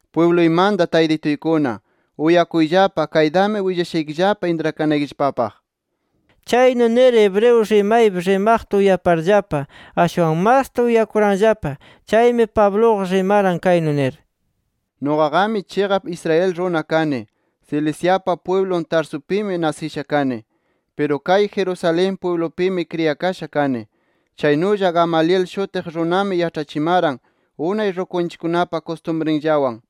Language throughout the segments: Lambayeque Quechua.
“Pwibluymanta taytituykuna uyakuyllapa, kaytami willashaykillapa intrakanaykillapapaq”. Chaynu nir hebreo rimaypi rimaqta uyaparllapa, ashwan masta uyakuranllapa. Chaymi, Pabluqa rimaran kaynu nir: “Nuqaqami chiqap Israel runa kani. Ciliciapa pwiblun Tarsupimi nasisha kani. Piru kay Jerusalén pwiblupimi kriyakasha kani. Chaynulla Gamaliel shutiq runami yaĉhachimaran, unay rukunchikkunapa kustumrinllawan.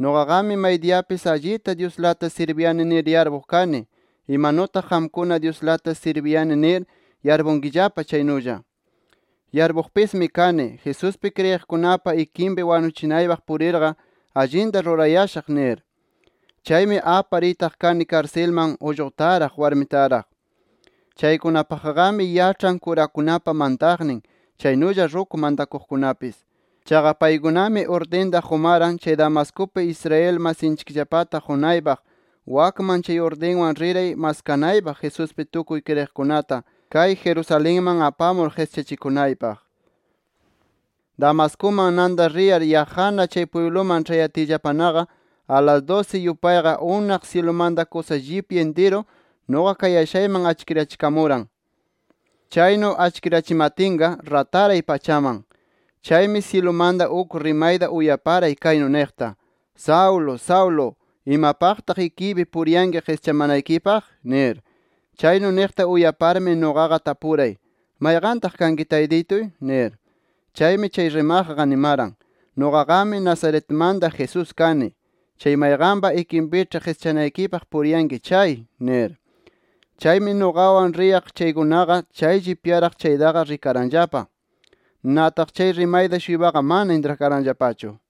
Nuqaqami maydiyapis allita Dyuslata sirbiyani nir yarpuq kani, imanutaq qamkuna Dyuslata sirbiyani nir yarpunkillapa chaynulla. Yarpuqpismi kani Jesuspi kriyiqkunapa ikinpi wanuchinaypaq purirqa, allinta rurayashaq nir. Chaymi apar itaq kani karsilman ullqutaraq warmitaraq. Chaykunapaqqami yaĉhan kurakunapa mantaqnin, chaynulla ruku mantakuqkunapis. Chaqa paykunami urdinta qumaran, chay Damascupi Israel masinchikllapata qunaypaq. Wakman chay urdinwan riray maskanaypaq Jesuspi tukuy kriyiqkunata kay Jerusalenman apamur qischachikunaypaq. “Damascuman nanta riyar yaqqana chay pwibluman ĉhayatiyllapanaqa, alas dusi yupayqa, unaq syilumanta kusa llipya intiru nuqa kayashayman achkirachikamuran. Chaynu achkirachimatinqa, rataray pachaman. Chaymi syilumanta uk rimayta uyaparay, kaynu niqta: ‘Saulo, Saulo. ¿Imapaqtaq ikiypi puriyanki qischamanaykipaq?’ nir. Chaynu niqta uyaparmi nuqaqa tapuray: ‘¿Mayqantaq kanki taytituy?’ nir. Chaymi chay rimaqqa nimaran: ‘Nuqaqami Nazaretmanta Jesús kani, chay mayqanpa ikinpiĉhi qischanaykipaq puriyanki chay’ nir. “Chaymi nuqawan riyaq chaykunaqa, chay llipyaraq chaytaqa rikaranllapa. Nataq chay rimayta-shuypaqa mana intrakaranllapachu.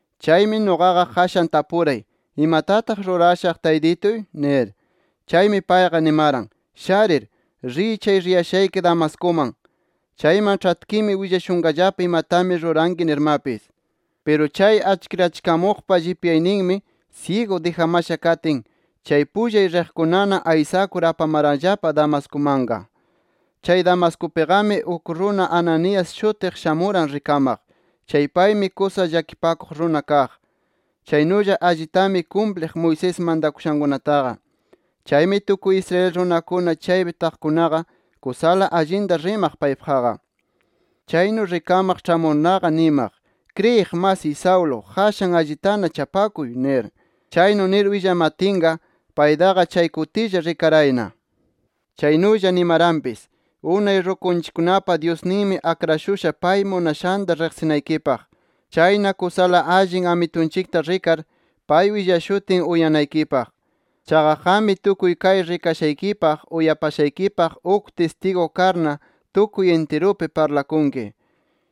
Chaymi nuqaqa qashan tapuray: ‘¿Imatataq rurashaq, Taytituy?’ nir. Chaymi payqa nimaran: ‘Sharir, riy chay riyashayki Damascuman. Chayman ĉhatkimi willashunqallapa imatami ruranki’ nirmapis. Piru chay achkirachikamuqpa llipyayninmi syigu dijamasha katin, chay pullay riqkunana aysakur apamaranllapa Damascumanqa. “Chay Damascupiqami uk runa Ananías shutiq shamuran rikamaq. Chay paymi kusa llakipakuq runa kaq. Chaynulla allitami kumpliq Moisés mantakushankunataqa. Chaymi tukuy Israel runakuna chaypi taqkunaqa kusala allinta rimaq paypaqqa. Chaynu rikamaq ĉhamurnaqa nimaq: ‘Kriyiq masiy Saulo, qashan allitana chapakuy’ nir. Chaynu nir willamatinqa, paytaqa chay kutilla rikarayna. Chaynulla nimaranpis: ‘Unay rukunchikkunapa Dyusninmi akrashusha pay munashanta riqsinaykipaq. Chayna kusala allin Amitunchikta rikar, pay willashutin uyanaykipaq. Chaqa qammi tukuy kay rikashaykipaq, uyapashaykipaq uk tistigu karna, tukuy intirupi parlakunki.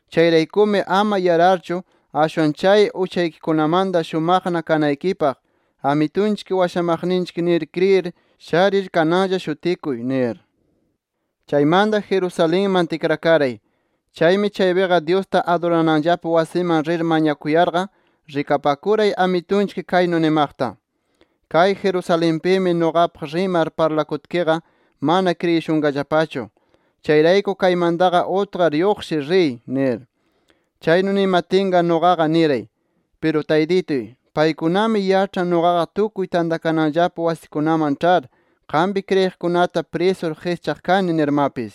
Chayraykumi, ama yararchu ashwan chay uchaykikunamanta shumaqna kanaykipaq, Amitunchik washamaqninchik nir kriyir sharir kananlla shutikuy’ nir. “Chaymanta Jerusalenman tikrakaray. Chaymi chaypiqa Dyusta adurananllapa wasiman rir mañakuyarqa, rikapakuray Amitunchik kaynu nimaqta: ‘Kay Jerusalenpimi nuqapaq rimar parlakutkiqa, mana kriyishunqallapachu. Chayrayku kaymantaqa utqar lluqshir riy’ nir. “Chaynu nimatinqa nuqaqa niray: ‘Piru Taytituy, paykunami yaĉhan nuqaqa tukuy tantakananllapa wasikunaman ĉhar, qampi kriyiqkunata prisur qischaq kani nirmapis.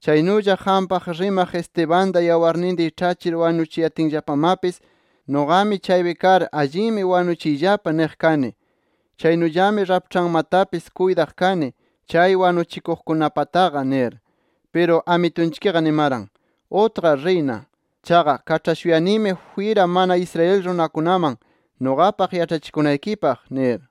Chaynulla qampaq rimaq Estebanta yawarninta iĉhachir wanuchiyatinllapamapis, nuqami chaypi kar allinmi wanuchiyllapa niq kani. Chaynullami raĉhpanmantapis kuytaq kani chay wanuchikuqkunapataqa’ nir. Piru Amitunchikqa nimaran: ‘Utqar riyna. Chaqa kaĉhashuyanimi jwira mana Israel runakunaman nuqapaq yaĉhachikunaykipaq’ nir”.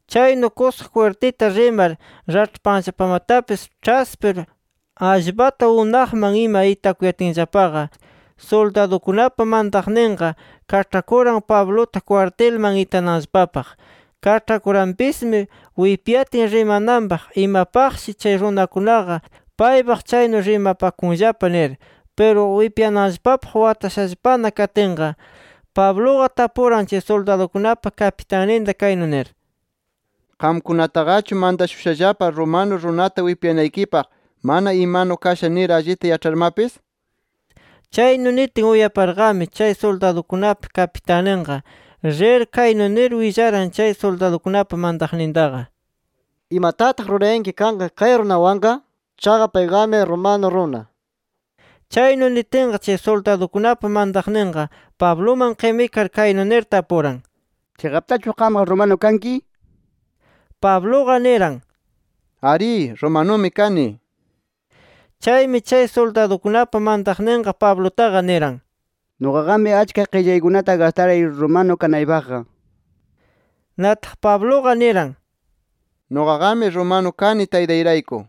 Chaynu kusa jwirtita rimar raĉhpanllapamatapis ĉhaspir, allpata unaqman ima itakuyatinllapaqa, suldadukunapa mantaqninqa kaĉhakuran Pabluta kwartilman itananllapapaq. Kaĉhakuranpismi wipyatin rimananpaq, imapaqshi chay runakunaqa paypaq chaynu rimapakunllapa nir. Piru wipyananllapapaq watashallapana katinqa, Pabluqa tapuran chay suldadukunapa kapitanninta kaynu nir: —¿Qamkunataqachu mantashushallapa romano runata wipyanaykipaq, mana imanu kasha nir allita yaĉharmapis? nir. Chaynu nitin, uyaparqami chay suldadukunapa kapitanninqa rir kaynu nir willaran chay suldadukunapa mantaqnintaqa: —¿Imatataq rurayanki kanqa kay runawanqa? Chaqa payqami romano runa nir. Chaynu nitinqa, chay suldadukunapa mantaqninqa Pabluman qimikar kaynu nir tapuran: —¿Chiqaptachu qamqa romano kanki? nir. Pabluqa niran: —Arí. Romanumi kani nir. Chaymi chay suldadukunapa mantaqninqa Pablutaqa niran: —Nuqaqami achka qillaykunata gastaray romano kanaypaqqa nir. Nataq Pabluqa niran: —Nuqaqami romano kani taytayrayku.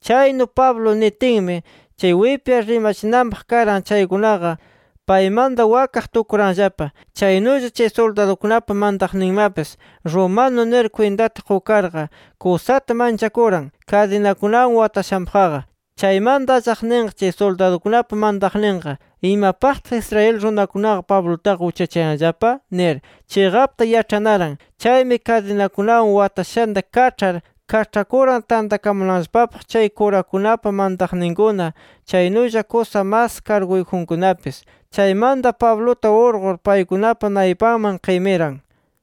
Chaynu Pablo nitinmi chay wipyar rimachinanpaq karan chaykunaqa paymanta wakaq tukuranllapa. Chaynulla chay suldadukunapa mantaqninmapis romano nir kwintata qukarqa, kusata manchakuran kadinakunawan watashanpaqqa. Chaymanta allaqninqa, chay suldadukunapa mantaqninqa, ¿imapaqtaq Israel runakunaqa Pablutaqa uchachayanllapa? nir chiqapta yaĉhanaran. Chaymi kadinakunawan watashanta kaĉhar, kaĉhakuran tantakamunanllapapaq chay kurakunapa mantaqninkuna, chaynulla kusa mas karguyjunkunapis. Chaymanta Pabluta urqur paykunapa naypanman qimiran.